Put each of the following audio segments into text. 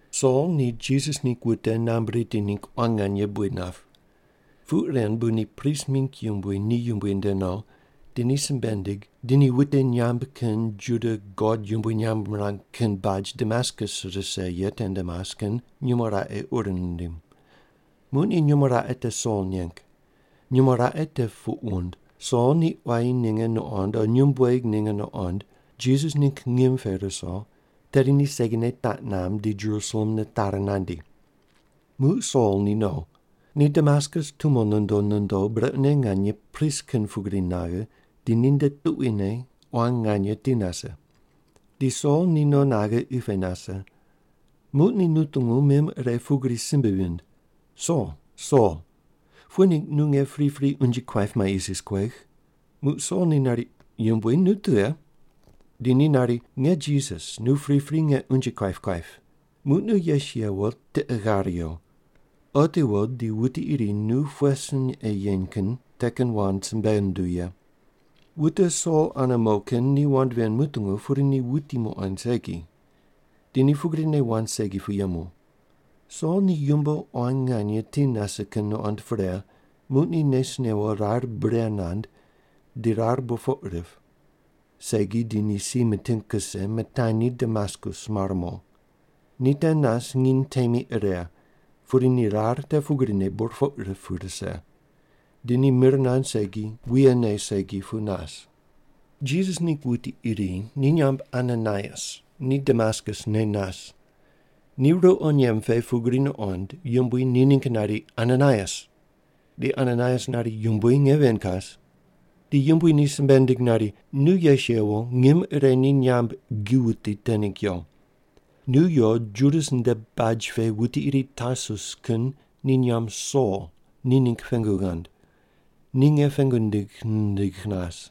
Sol ni Jisas ningg wute namb riti ningg quan nganye buid nap. Puq ren bu ni prist mingg yumbui ni yumbui nde no, di ni simbe nindig, di ni wute nyamb kin Juda God yumbui nyamb mirang kin baj Damaskus rise ye tende mas kin nyumo raqe ur nindim. Muq ni nyumo raqe te Sol neng. Nyumo raqe te puq wund: “Sol ni quayi ninge nuqond o nyumbueg ninge nuqond Jisas ningg ngim pe ruso, tedi ni segine taq namb, di Jerusalem nitari nandi.” Muq Sol ni no. Ni Damaskus tumo nondo nondo, brequne nganye pris kin pugri naghe, di ninde tuquine quan nganye ti nase. Di Sol ni no naghe qi pe nase. Muq ni nutungu mim ire pugri simbe vind, “Sol, Sol, pughe ningg nu nge pripri unje kuaip mai isis kuegh?” Muq Sol ni nari, “Yumbui, nu tughe?” Di ni nari, “Nge Jisas, nu pripri nge unje kuaip kuaip. Muq nu yes yewo, tiqe ghar yo. Otiwo di wuti iri nu pughe sin ei yen kin te kin wand simbe nunduw ye.” Wute Sol ane mo kin ni wand ven mutungu, pudi ni wuti muqoind segi. Di ni pugrine wand segi pu yemu. Sol ni yumbo quan nganye ti nase kin nuqond pre, muq ni nes newo rar bure nand, di rar burpoq rip. Segi di ni si miting kuse, mitanyi Damaskus mar mo. Ni te nas nginy temi ire, pudi ni rar te pugrine burpoq rip pu rise. Di ni mir nand segi wuye ne segi pu nas. Jisas ningg wuti iri ni nyamb Ananaias ni Damaskus ne nas. Ni ruqo nyemb pe pugri nuqond, Yumbui ni ningg nari, “Ananaias!” Di Ananaias nari, “Yumbui nge ven kas.” Di Yumbui ni simbe nindig nari, “Nu yes yewo, ngim ire ni nyamb Gi Wuti te ningg yo. Nu yo Judas nde baj pe wuti iri Tarsus kin ni nyamb Sol ni ningg pengu ghand. Ni nge pengu nindigh nindigh nas.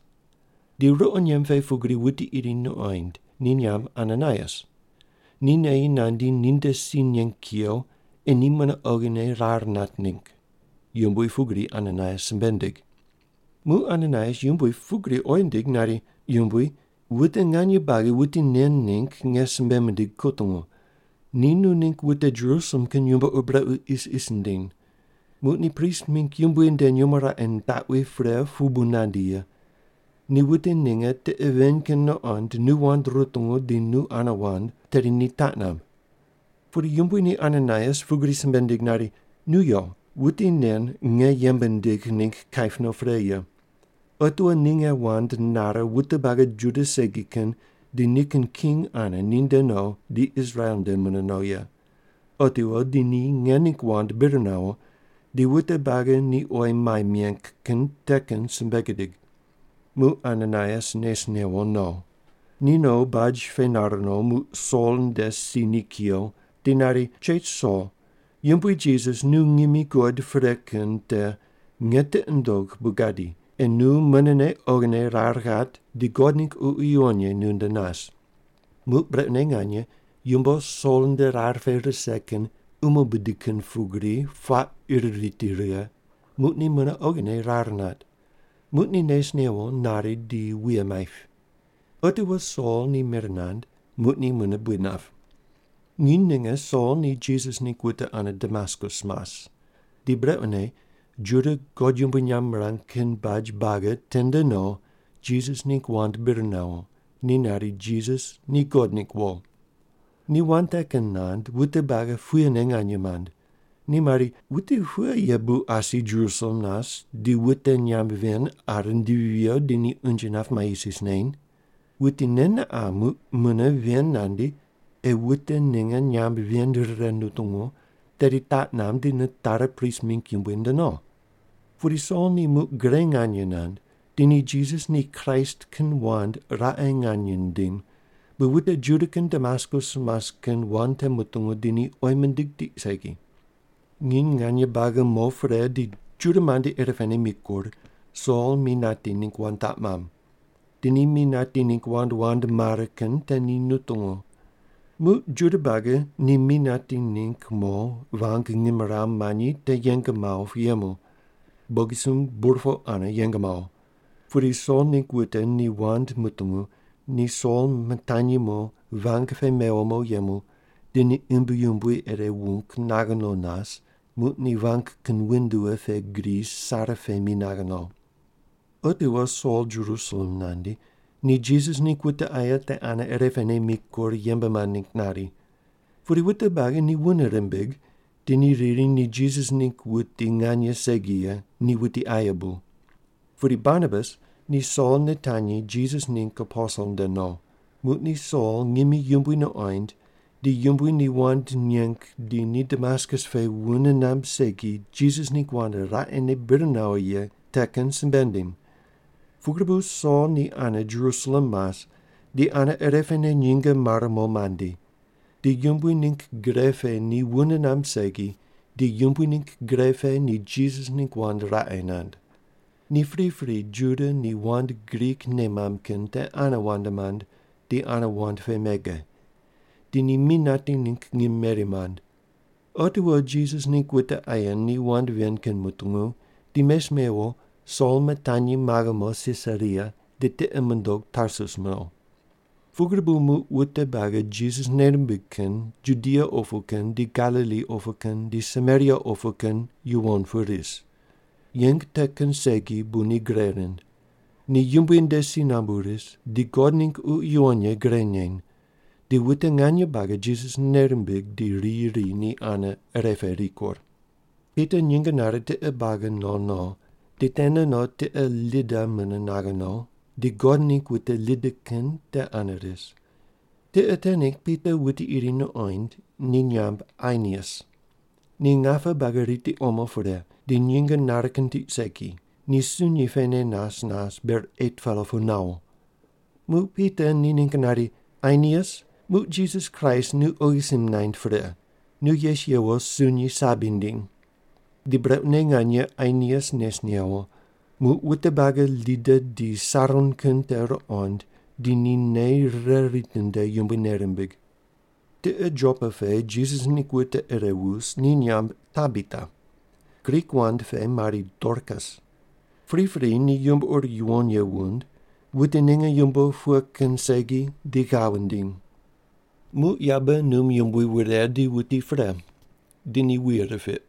Di ruqo nyemb pe pugri wuti iri nuqoind, ni nyamb Ananaias. Ni neyi nandi, ninde si neng kuyo, ei ni mune oghine rar nat ningg.” Yumbui pugri Ananaias simbe nindig. Muq Ananaias Yumbui pugri oyi nindig nari, “Yumbui, wute nganye buagi wuti nen ningg nge simbe mindigh kutungu, ni nu ningg wute Jerusalem kin yumbo ur brequ isis nindiny. Muq ni prist mingg yumbui nde nyumo raqe nitaqwi pre pu bu nandi ye. Ni wute ninge tiqe ven kin nuqond nu wand rutungu di nu ane wand, tedi ni taq namb.” Pudi Yumbui ni Ananaias pugri simbe nindig nari, “Nu yo. Wuti nen nge yembe nindigh ningg kaip no pre ye. Otiwo ni nge wand nare wute buagi Juda segi kin di nikin king ane ninde no di Israel nde mune no ye. Otiwo di ni nge ningg wand bir nawo, di wute buagi ni oyi mai meng kin te kin simbe gidig.” Muq Ananaias nes newo no. Ni no baj pe nar no, muq Sol nde si ni kuyo di nari, “Chech Sol, Yumbui Jisas nu ngimi guqoid pre kin te nge tiqi nundogh bu gadi, ei nu munene oghine rar ghat, di God ningg Ququ Yuwon Ye nunde nas.” Muq brequne nganye yumbo Sol nde rar pe rise kin umo bidi kin pugri puaq ir riti righe, muq ni mune oghine rar nat. Muq ni nes newo nari di wuye maip. Otiwo Sol ni mir nand, muq ni mune buid nap. Nginy ninge Sol ni Jisas ningg wute ane Damaskus mas. Di brequne Juda God yumbui nyamb mirang kin baj buagi tende no Jisas ningg wand bir nawo, ni nari, “Jisas ni God ningg wo.” Ni wand te kin nand, wute buagi puyene nganye mand. Ni mari, “Wuti pughe ye bu asi Jerusalem nas di wute nyamb ven qa rindivi viyo di ni unje nap mai isis neny? Wuti nen ne qa muq mune ven nandi ei wute ninge nyamb ven rire nutungu, tedi taq namb di nitari prist mingg yumbui nde no.” Pudi Sol ni muq gre nganye nand. Di ni Jisas ni Kraist kin wand raqe nganye nindim, bu wute Juda kin Damaskus mas kin wand te mutungu, di ni oyi mindig tiq segi. Nginy nganye buagi mo pre di Juda mandi irepene mikur, Sol mi nati ningg wand taq mamb. Di ni mi nati ningg wand wand mare kin te ni nutungu. Muq Juda buagi ni mi nati ningg mo vang ngimrawu manyi te yeng mawo pu yemu. Bogisumb burpoq ane yeng mawo. Pudi Sol ningg wute ni wand mutungu ni Sol mitanyi mo vang pe mewo mo yemu di ni imbi yumbui ire wung naghe no nas muq ni vang kin windua pe gri sare pe mi naghe no. Otiwo Sol Jerusalem nandi, ni Jisas ningg wute aye te ane irepene mikur yembe mand ningg nari. Pudi wute buagi ni wune rimbig, di ni riri ni Jisas ningg wuti nganye segi ye, ni wuti aye bu. Pudi Barnabas ni Sol nitanyi Jisas ningg aposel nde no. Muq ni Sol ngimi Yumbui nuqoind, di Yumbui ni wand neng di ni Damaskus pe wune namb segi Jisas ningg wand raqene bir nawo ye te kin simbe nindim. Pugri bu Sol ni ane Jerusalem mas di ane irepene nyinge mare mo mandi. Di Yumbui ningg gre pe ni wune namb segi, di Yumbui ningg gre pe ni Jisas ningg wand raqe nand. Ni pripri Juda ni wand Grik nei mamb kin te ane wand mand, di ane wand pe mege. Di ni mi nati ningg ngim meri mand. Otiwo Jisas ningg wute aye ni wand ven kin mutungu, di mes mewo Sol mitanyi maghe mo Sisaria di tiqi mundog Tarsus no. Pugri bu muq wute buagi Jisas nei rimbig kin, Judia opu kin di Galili opu kin di Samaria opu kin, yuwon pu ris. Yeng te kin segi bu ni gre rind. Ni Yumbui nde si nambu ris, di God ningg Ququ Yuwon Ye gre neny. Di wute nganye buagi Jisas nei rimbig, di riyi ri ni ane ire pe rikur. Pita nyinge nare tiqe buagi no no, di tene no tiqe Lida mune naghe no, di God ningg wute Lida kin te ane ris. Tiqe te ningg Pita wuti iri nuqoind, ni nyamb Ainias. Ni ngape buagi riti omo pre, di nyinge nare kin tiq segi, ni sunyi pene nas nas ber 8-pela pu nawo. Muq Pita ni ningg nari, “Ainias muq Jisas Kraist nu oghi sim naind pre. Nu yes yewo sunyi sabi ndiny.” Di brequne nganye Ainias nes newo. Muq wute buagi Lida di Saron kin te ruqond, di ni nei rire ritinde, Yumbui nei rimbig. Tiqe Jopa pe Jisas ningg wute ire wus, ni nyamb Tabita. Grik wand pe mari Dorkas. Pripri ni yumbo ur yuwon ye wund, wute ninge yumbo pughe kin segi di ghav wundiny. Muq yabe num yumbui wure di wuti pre. Di ni wuye ripiq.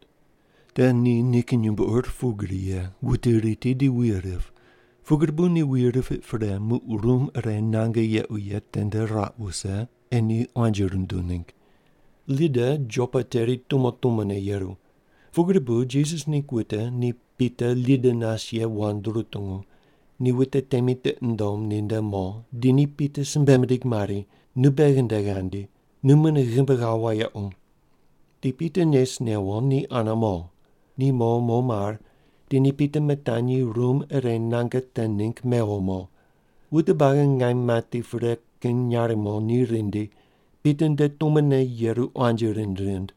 Te ni nikin yumbo ur pugri ye, wute riti di wuye rip, pugri bu ni wuye ripiq pre, muq rum ire nange yequ ye tende ruaq wuse, ei ni quanji runduw ningg. Lida Jopa teri tumo tumone yeru. Pugri bu Jisas ningg wute ni Pita Lida nas ye wand rutungu, ni wute temi tiqi mundom ninde mo, di ni Pita simbe mindig mari, “Nu beghi nde ghandi. Nu mune ghimbi ghawo wayequ.” Di Pita nes newo ni ane mo. Ni mo mo mar, di ni Pita mitanyi rum ire nange te ningg mewo mo. Wute buagi ngaim mati pre kin nyarimo ni rindi, Pita nde tumone yeru quanji rind rind.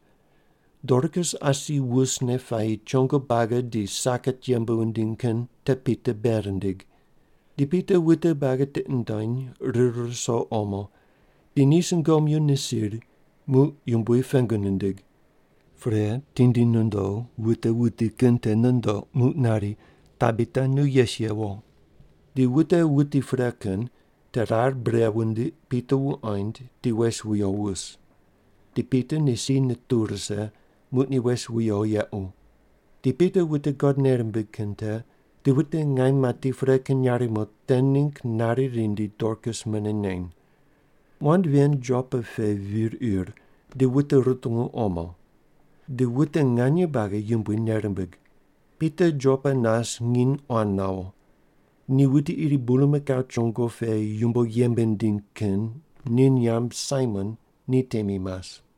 Dorkas asi wusne puayi chongo buagi di saket yembe wundiny kin te Pita bei rindig. Di Pita wute buagi tiqi nundony rir ruso omo, di ni sungomyu nisiri, muq Yumbui pengu nindig. Pre tindi nondo wute wuti kin te nundoq, muq nari, “Tabita nu yes yewo.” Di wute wuti pre kin te rar bure wundiq Pita wuqoind di wes wuyo wus. Di Pita ni si nituw rise, muq ni wes wuyo yequ. Di Pita wute God nei rimbig kin te di wute ngaim mati pre kin nyarimo te ningg nari rindi Dorkas mune neny. Wand ven Jopa pe vir ir, di wute rutungu omo. Di wute nganye buagi Yumbui nei rimbig. Pita Jopa nas nginy quan nawo. Ni wuti iri bulmakau chongo pe yumbo yembe nindiny kin ni nyamb Saimon ni temi mas.